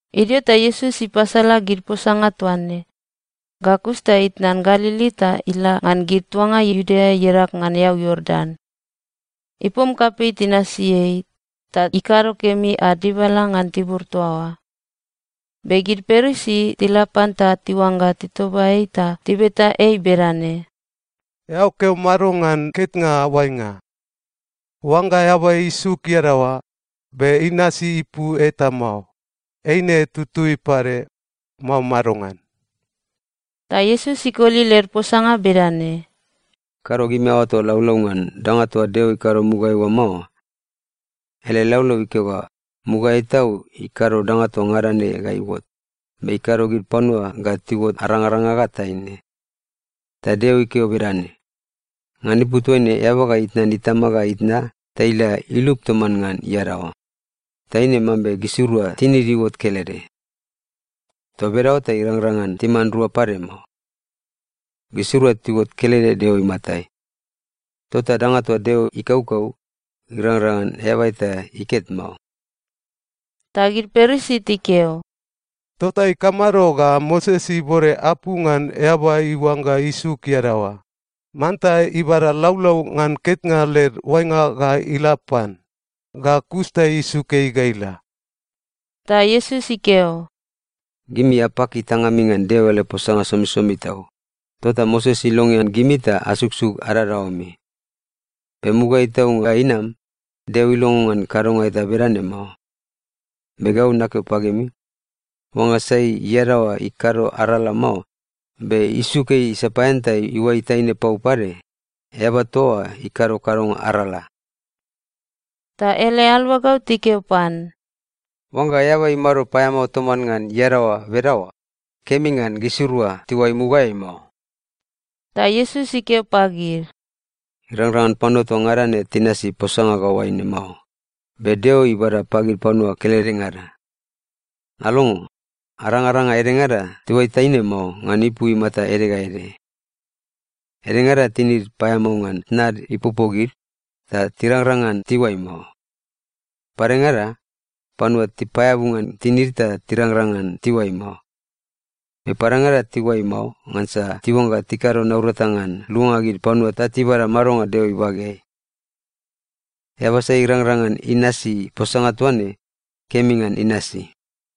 Idio ta Iesus ipasala gid posanga toa ne. Ga kus ta itnan Galili ta ila ngan gid tuanga Iudea iadag ngan eau Iordan. Ipom kapei tinasi ei, ta ikado kemi ad dibala ngan tibur toa oa. Be gid Parisi tila pan ta tiuangga titoba ei ta tibeta ei bedane, “Eao keo mado ngan ketnga oainga? Oangga eaba isuk iadaoa, be inasi ipu eta mao, eine tutui pade, mao madongan?” Ta Iesus ikoli led posanga bedane, “Kado gimi aoato laulau ngan danga toa Deo ikado mugaeai oa mao? Ele laulau ikeo ga mugaeai tau ikado danga toa ngada ne ga iuot, be ‘ikado gid panua ga tiuot arangaranga ga taine.’ Ta Deo ikeo bedane, ‘Ngan ipu toaine eaba ga itnan itama ga itna ta ila ilup toman ngan iadaoa, ta eine mambe gisirua tinid iuot kelede.’ Toa bedaoa ta tirangrang ngan timan rua pade mao. Gisirua tiuot kelede Deo imatai. Tota danga toa Deo ikaukau, irangrang ngan eaba eta iket mao.” Ta gid Parisi tikeo, “Tota ikamado ga Moses ibode apu ngan eaba iuangga isuk iadaoa, manta ibada laulau ngan ketnga led oainga ga ila pan, ga kus ta isuk ei ga ila?” Ta Iesus ikeo, “Gimi apaki tangami ngan Deo ele posanga somisomi tau, tota Moses ilongean gimi ta asuksuk adadaoami. Be mugaeai tau ga inam, Deo ilongo ngan kadonga eta bedane mao. Be gau nakeo pagimi, oangga sai iadaoa ikado arala mao, be isuk ei sapaean ta iuai taine pau pade, eaba toa oa ikado kadonga arala.” Ta ele aluagau tikeo pan, “Oangga eaba imado paeamao toman ngan iadaoa bedaoa, kemi ngan gisirua tiuai mugaeai mao.” Ta Iesus ikeo pagid, “Irangrang ngan panua toa ngada ne tinasi posanga ga oaine mao, be Deo ibada pagid panua keledengada. Alongo, arangaranga edengada tiuai taine mao ngan ipu imata ede ga ede. Edengada tinid paeamao ngan tnad ipopo gid, ta tirangrang ngan tiuai mao. Padengada, panua tipaeabu ngan tinid ta tirangrang ngan tiuai mao. Be padengada tiuai mao ngansa tiuangga tikado naurata ngan luanga gid panua ta tibada madonga Deo ibageai. Eaba sai irangrang ngan inasi posanga toa ne, kemi ngan inasi.”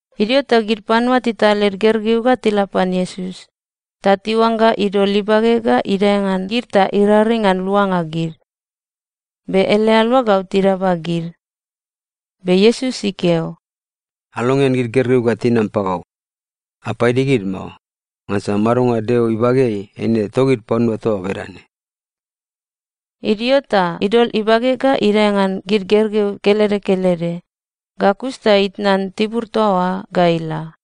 Idio ta gid panua tital led gergeu ga tila pan Iesus, ta tiuangga idol ibage ga idae ngan gid ta iraring ngan luanga gid. Be ele aluagau tidaba gid. Be Iesus ikeo, “Alongean gid gergeu ga tinam pagau. Apaidi gid mao. Ngansa madonga Deo ibageai eine togid panua toa bedane.” Idio ta idol ibage ga idae ngan gid gergeu kelede kelede, ga kus ta itnan tibur toa oa ga ila.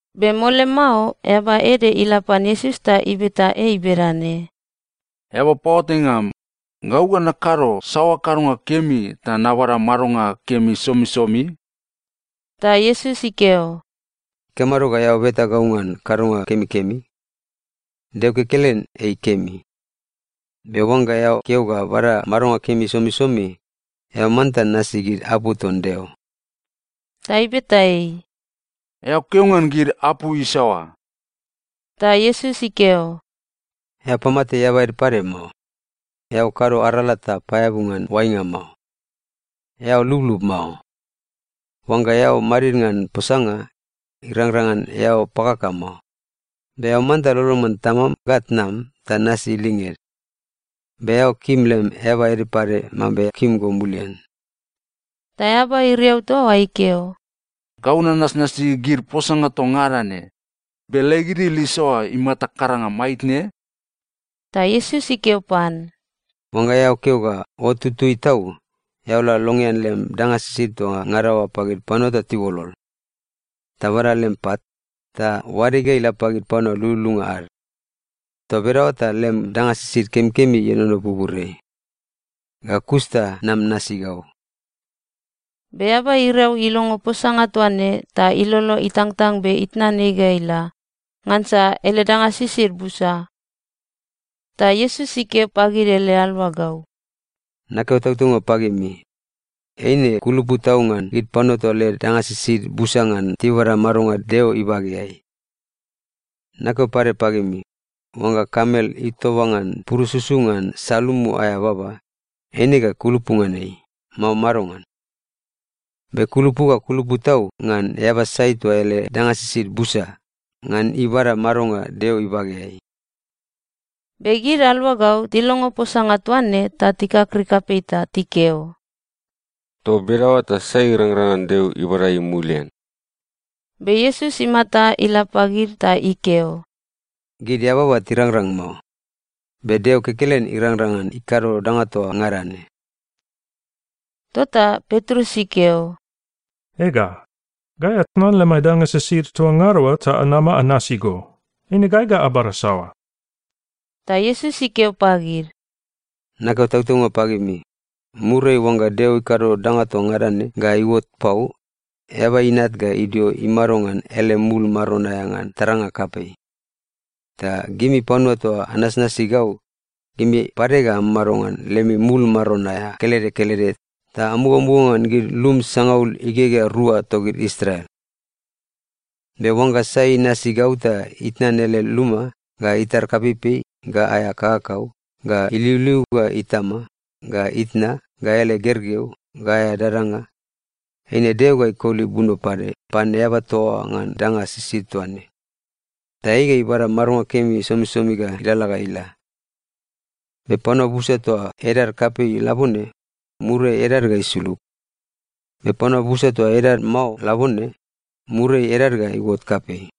Be mole mao eaba ede ila pan Iesus ta ibeta ei bedane, “Eaba paoatainga am, gau ga nakado saoa kadonga kemi ta nabada madonga kemi somisomi?” Ta Iesus ikeo, “Ikamado ga eao beta gau ngan kadonga kemikemi? Deo kekelen ei kemi. Be oangga eao keo ga bada madonga kemi somisomi, eao manta nasi gid apu ton Deo.” Ta ibeta ei, “Eao keo ngan gid apu isaoa?” Ta Iesus ikeo, “‘Eao pamate eaba ede pade mao, eao kado arala ta paeabu ngan oainga mao, eao lublub mao, oangga eao madid ngan posanga, irangrang ngan eao pakaka mao, be eao manta lolon ngan tamam ga tnam ta nasi linged. Be eao kim lem eaba ede pade mambe kim go mulian.’” Ta eaba iriau toa oa ikeo, “Gau nanasnasi gid posanga toa ngada ne. Be leg idil isaoa imata karanga maitne?” Ta Iesus ikeo pan, “Oangga eao keo ga ot tutui tau, eao la longean lem danga sisid toa ngada oa pagid panua ta tiuolol. Ta bada lem pat, ta oade ga ila pagid panua lululunga ad. Toa bedaoa ta lem danga sisid kemikemi ienono buburiai. Ga kus ta nam nasi gau.” Be eaba iriau ilongo posanga toa ne ta ilolo itangtang be itnan ei ga ila. Ngansa ele danga sisid busa. Ta Iesus ikeo pagid ele aluagau, “Nakeo tautaunga pagimi, eine kulupu tau ngan gid panua toa led danga sisid busa ngan tibada madonga Deo ibageai. Nakeo pade pagimi, oangga kamel itoba ngan ipurususu ngan salumu aea baba, eine ga kulupu ngan ei, mao madongan? Be kulupu ga kulupu tau ngan eaba sai toa ele danga sisid busa, ngan ibada madonga Deo ibageai.” Be gid aluagau tilongo posanga toa ne ta tikakrik kapei ta tikeo, “Toa bedaoa ta sai irangrang ngan Deo ibada ei mulian?” Be Iesus imata ila pagid ta ikeo, “Gid eababa tirangrang mao. Be Deo kekelen irangrang ngan ikado danga toa ngada ne.” Tota Petrus ikeo, “Ega, gai atnan lemai danga sisid toa ngada oa ta anama anasi go. Eine gai ga abada saoa?” Ta Iesus ikeo pagid, “Nakeo tautaunga pagimi, muriai oangga Deo ikado danga toa ngada ne ga iuot pau, Eaba Inat ga idio imado ngan ele mul Maron aea ngan taranga kapei. Ta gimi panua toa anasnasi gau, gimi pade ga amamado ngan lemi mul maron aea kelede kelede ta amugamuga ngan gid lum sangaul igegea rua togid Israel. Be oangga sai inasi gau ta itnan ele luma, ga itar kapeipei, ga aea kakakau, ga iliuliu, ga itama, ga itna, ga ele gergeu, ga aea dadanga, eine Deo ga ikoli buno pade pan eaba toa oa ngan danga sisid toa ne, ta ei ga ibada madonga kemi somisomi ga ilalala ga ila. Be panua busa toa edad kapei labone, muriai edad ga isulug. Be panua busa toa edad mao labone, muriai edad ga iuot kapei.”